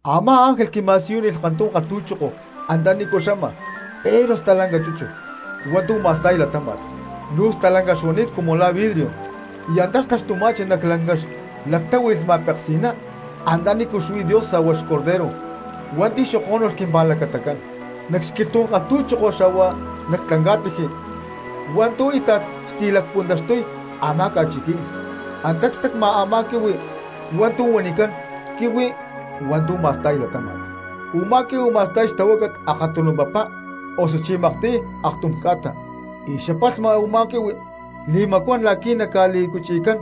Amá ángel quima̠siyúnilh kantum kalhtu̠choko antanícu xama pero stalanca chúchut hua̠ntu̠ ma̠sta̠y latáma̠t. Luu stalanca xuani̠t cumu la̠ vidrio, y antá xtaxtuma̠chi nac lanca xlactáhui̠lh ma̠peksi̠ná antanícu xuí Dios xa̠hua xBorrego hua̠nti̠ xokó̠nulh quimpa̠lacatacán. Nac xquilhtu̠ní̠n kalhtu̠choko xa̠hua nac tlanca̠tiji hua̠ntu̠ íta̠t xtilacpuntaxtuy a̠má ca̠chiquí̠n, antá cstacma a̠má quihui hua̠ntu̠ huanicán quihui hua̠ntu̠ ma̠sta̠y latáma̠t, u̠má quihui ma̠sta̠y xtahuácat akatunu papa, osuchí makcu̠tiy aktum ca̠ta; y xapalhma u̠ma quihui li̠macuán la̠qui̠ naca̠li̠cuchi̠cán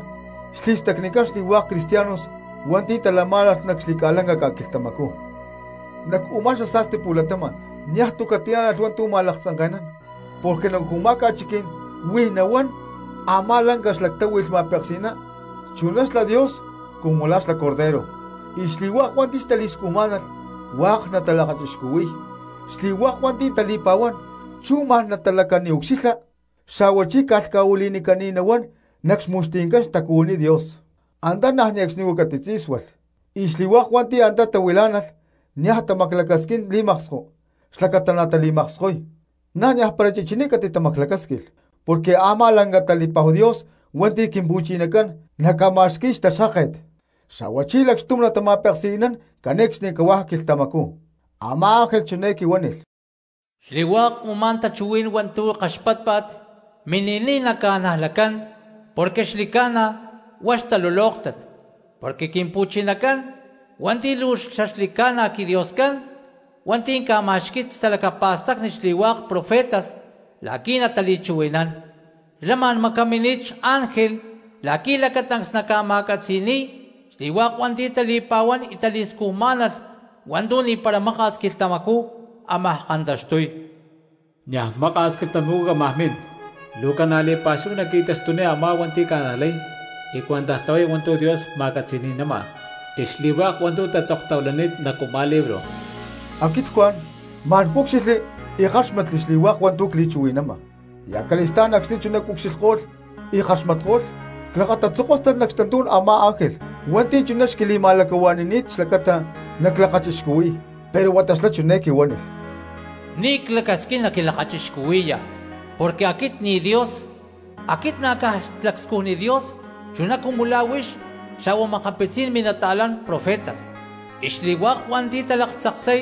xli̠stacnicán xli̠hua̠k cristianos hua̠nti̠ talamá̠nalh nac xli̠ca̠lanca ca̠quilhtamacú. Nac u̠má xasa̠sti pu̠latama̠n niaj tu̠ catiánalh hua̠ntu̠ ma̠laktzanke̠nán porque nac u̠má ca̠chiquí̠n huij nahuán a̠má lanca xlactáhui̠lh ma̠peksi̠ná chuná xlá Dios cumu la̠ xla xBorrego, y xli̠hua̠k hua̠nti̠ xtali̠scujmá̠nalh hua̠k natalakachixcuhui̠y. Xli̠hua̠k hua̠nti̠ tali̠pa̠huán chú ma̠n natalacaniucxilha, xa̠huachí ca̠lhca̠huili̠nicani̠t nahuán nac xmu̠xti̠ncán xtacuhuiní Dios. Antá niaj ne̠cxnicú catitzí̠sualh, y xli̠hua̠k hua̠nti̠ antá tahuilá̠nalh niaj tamaclacasquín li̠maksko xlacata natali̠makskoy, na̠ niajpara chichiní catitamaclacásquilh, porque a̠má lanca tali̠pa̠hu Dios hua̠nti̠ Quimpu̠chinacán naca̠ma̠xqui̠y xtaxkáket, xa̠huachí lacxtum natamakma̠peksi̠nán cane̠cxnicahuá quilhtamacú. Amá ángel chiné quihua̠nilh: —Xli̠hua̠k u̠má tachuhuí̠n hua̠ntu̠ kaxpátpa̠t, mini̠niy naca̠najlacán porque xli̠ca̠na huá xtalulóktat. Porque Quimpu̠chinacán hua̠nti̠ luu xaxli̠ca̠na quiDioscán, hua̠nti̠ ca̠ma̠xqui̠y talacapa̠stacni xli̠hua̠k profetas la̠qui̠ natali̠chuhui̠nán, xlá ma̠n macamini̠t xángel la̠qui̠ lacatancs naca̠ma̠catzi̠ni̠y xli̠hua̠k hua̠nti̠ tali̠pa̠huán y tali̠scujmá̠nalh hua̠ntu̠ ni̠para maka̠s quilhtamacú ámaj kantaxtuy. —¡Niaj maka̠s quilhtamacú cámaj min! ¡Luu ca̠na li̠pa̠xúhu naqui̠taxtuniy a̠má hua̠nti̠ ca̠najlay y cuentaj tlahuay hua̠ntu̠ Dios ma̠catzi̠ni̠nama, y xli̠hua̠k hua̠ntu̠ tatzoktahuilani̠t nac u̠má libro! Aquit Juan ma̠n cúcxilhli y ckáxmatli xli̠hua̠k hua̠ntu̠ cli̠chuhui̠nama. Y acali̠stá̠n acxni̠ chuná cucxilhko̠lh y ckaxmatko̠lh, clakatatzokóstalh nac xtantú̠n a̠má ángel hua̠nti̠ chuná xquili̠ma̠lacahua̠ni̠ni̠t xlacata naclakachixcuhui̠y. Pero huata xlá chiné quihuánilh: —Ni̠ clacasquín naquilakachixcuhui̠ya, porque aquit ni̠ Dios, aquit na̠ caj xlacscujni Dios chuná cumu la̠ huix xa̠hua makapitzí̠n minata̠lán profetas, y xli̠hua̠k hua̠nti̠ talaktzaksay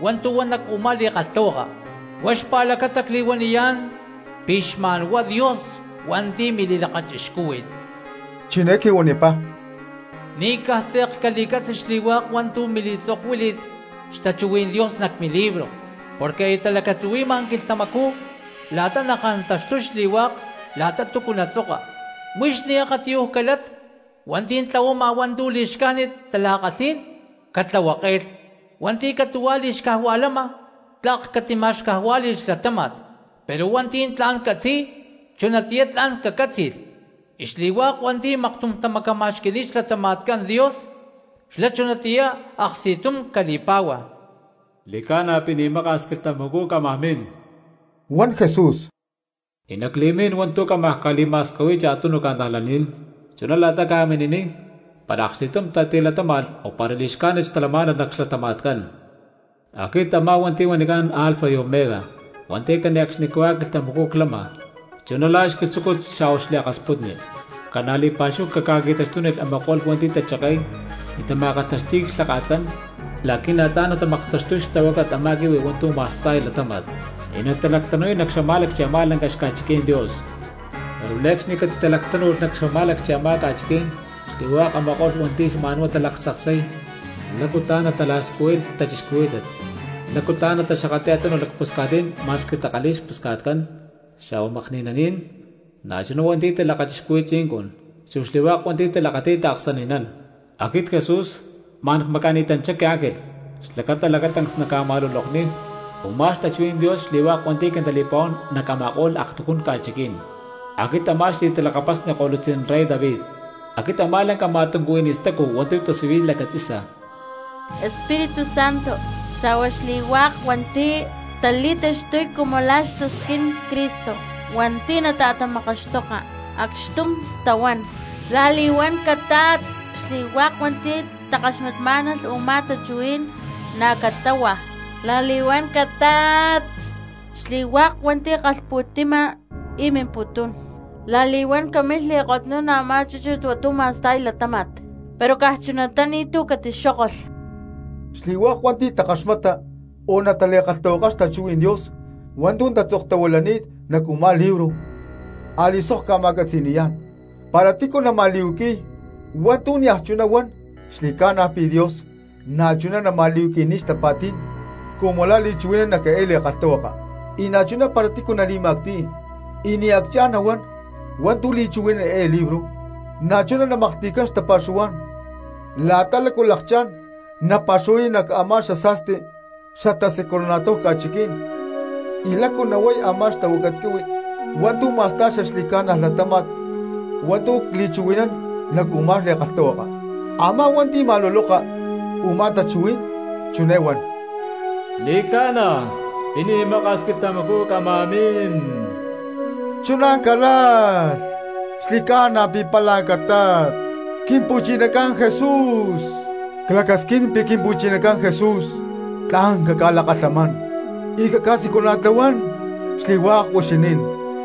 hua̠ntu̠ huan nac u̠má li̠kalhtahuaka. Huá xpa̠lacata cli̠huaniyá̠n pi̠ xma̠n huá Dios hua̠nti̠ mili̠lakachixcúhui̠t. Chiné quihuanipá: —Ni̠ caj tze̠k cali̠catzi xli̠hua̠k hua̠ntu̠ mili̠tzokuíli̠t xtachuhuí̠n Dios nac milibro, porque aya talacatzuhui̠ma quilhtamacú la̠ta nakantaxtuy xli̠hua̠k la̠ta túcu natzoka. Huix ni̠ akatiyuj calat, hua̠nti̠ tlahuama hua̠ntu̠ li̠xcájnit tala̠kalhí̠n, catlahuake̠lh; hua̠nti̠ catu̠huá li̠xcajua̠lama, tlak catima̠xcajuá̠li̠lh xlatáma̠t; pero hua̠nti̠ tla̠n catzi̠y, chunatiyá tla̠n cacátzi̠lh; y xli̠hua̠k hua̠nti̠ maktum tamacama̠xqui̠ni̠t xlatama̠tcán Dios, xlá chunatiyá aksti̠tum cali̠pá̠hua. —Xli̠ca̠na pi̠ ni̠ maka̠s quilhtamacú cámaj min —huan Jesús—, y nacli̠mín hua̠ntu̠ cámaj ca̠li̠ma̠skahui̠y cha̠tunu cristianos, chuná la̠ta ca̠mini̠niy, para aksti̠tum tatilatama̠ni̠t o para li̠xcájnit xtalamá̠nalh nac xlatama̠tcán. Aquit a̠má hua̠nti̠ huanicán Alfa y Omega, hua̠nti̠ cane̠cxnicahuá quilhtamacú clama, chuná la̠ xquilhtzúcut xa̠huá xliakasputni. Ca̠na li̠pa̠xúhu ca̠qui̠taxtuniy a̠ma̠ko̠lh hua̠nti̠ tacheke̠y y tama̠kalhtaxti̠y clhaka̠tcán la̠qui̠ na̠ tla̠n natamaktaxtuy xtahuácat a̠má quihui hua̠ntu̠ ma̠sta̠y latáma̠t y natalactanu̠y nac xamá̠lacchi a̠má lanca xca̠chiquí̠n Dios. Pero ne̠cxni catitalactánu̠lh nac xamá̠lacchi a̠má ca̠chiquí̠n xli̠hua̠k a̠ma̠ko̠lh hua̠nti̠ xma̠n huá talaktzaksay lácu tla̠n natalacscuhuay xta̠cristianos, lácu tla̠n nataxakatli̠y a̠tunuj lacpusca̠tní̠n ma̠squi takalhi̠y xpusca̠tcán, xa̠hua makni̠naní̠n, na̠chuná hua̠nti̠ talakachixcuhui̠y tzincun, chu xli̠hua̠k hua̠nti̠ talakati̠y taaksani̠nán. —Aquit Jesús, ma̠n cmaca̠ni̠tanchá quiángel xlacata lacatancs naca̠ma̠lulokniy u̠má xtachuhuí̠n Dios xli̠hua̠k hua̠nti̠ quintali̠pa̠huán nac a̠ma̠ko̠lh aktujún ca̠chiquí̠n. Aquit a̠má xli̠talakapasni ko̠lutzí̠n rey David. Aquit a̠má lanca ma̠tuncuhuiní stacu hua̠ntu̠ tasiyuy lacatzi̠sa. Espíritu Santo xa̠hua xli̠hua̠k cristianos hua̠nti̠ tali̠taxtuy cumu la̠ a̠má xtasquín Cristo hua̠nti̠ nata̠tamakaxtoka, acxtum tahuán: —¡La̠li̠huán catat! Xli̠hua̠k hua̠nti̠ takaxmatmá̠nalh úmá tachuhuí̠n na̠ catáhua: —¡La̠li̠huán catat! Xli̠hua̠k hua̠nti̠ kalhpu̠ti̠ma y mimputún, la̠li̠huán camilh li̠kotnún a̠má chúchut hua̠ntu̠ ma̠sta̠y latáma̠t, pero caj chunatá ni̠tu̠ catixókolh. Xli̠hua̠k hua̠nti̠ takaxmata o natali̠kalhtahuakay xtachuhuí̠n Dios hua̠ntu̠ tatzoktahuilani̠t nac u̠má libro a̠li̠sok cca̠ma̠catzi̠ni̠yá̠n: Para tícu nama̠li̠huaqui̠y hua̠ntu̠ niaj chuná huán, xli̠ca̠na pi̠ Dios na̠chuná nama̠li̠huaqui̠niy xtapa̠tí̠n cumu la̠ li̠chuhui̠nán nac eé li̠kalhtahuaka. Y na̠chuná para tícu nali̠ma̠cti̠y y ni̠ acchá̠n nahuán hua̠ntu̠ li̠chuhui̠nán eé libro, na̠chuná namaklhti̠cán xtapa̠xuhuá̠n la̠ta lácu xlakchá̠n napa̠xuhuay nac a̠má xasa̠sti xatasiculana̠tláhu ca̠chiquí̠n y lácu nahuay a̠má xtahuácat quihui hua̠ntu̠ ma̠sta̠y xaxli̠ca̠na latáma̠t hua̠ntu̠ cli̠chuhui̠nán nac u̠má li̠kalhtahuaka. Amá hua̠nti̠ ma̠luloka u̠má tachuhuí̠n, chiné huán: —¡Xli̠ca̠na pi̠ ni̠ maka̠s quilhtamacú cámaj min! ¡Chuná calalh! ¡Xi̠ca̠na pi̠ pála catat, Quimpu̠chinacán Jesús! Clacasquín pi̠ Quimpu̠chinacán Jesús lán caca̠lakalhamán, y caca̠siculana̠tlahuán xli̠hua̠k huixinín.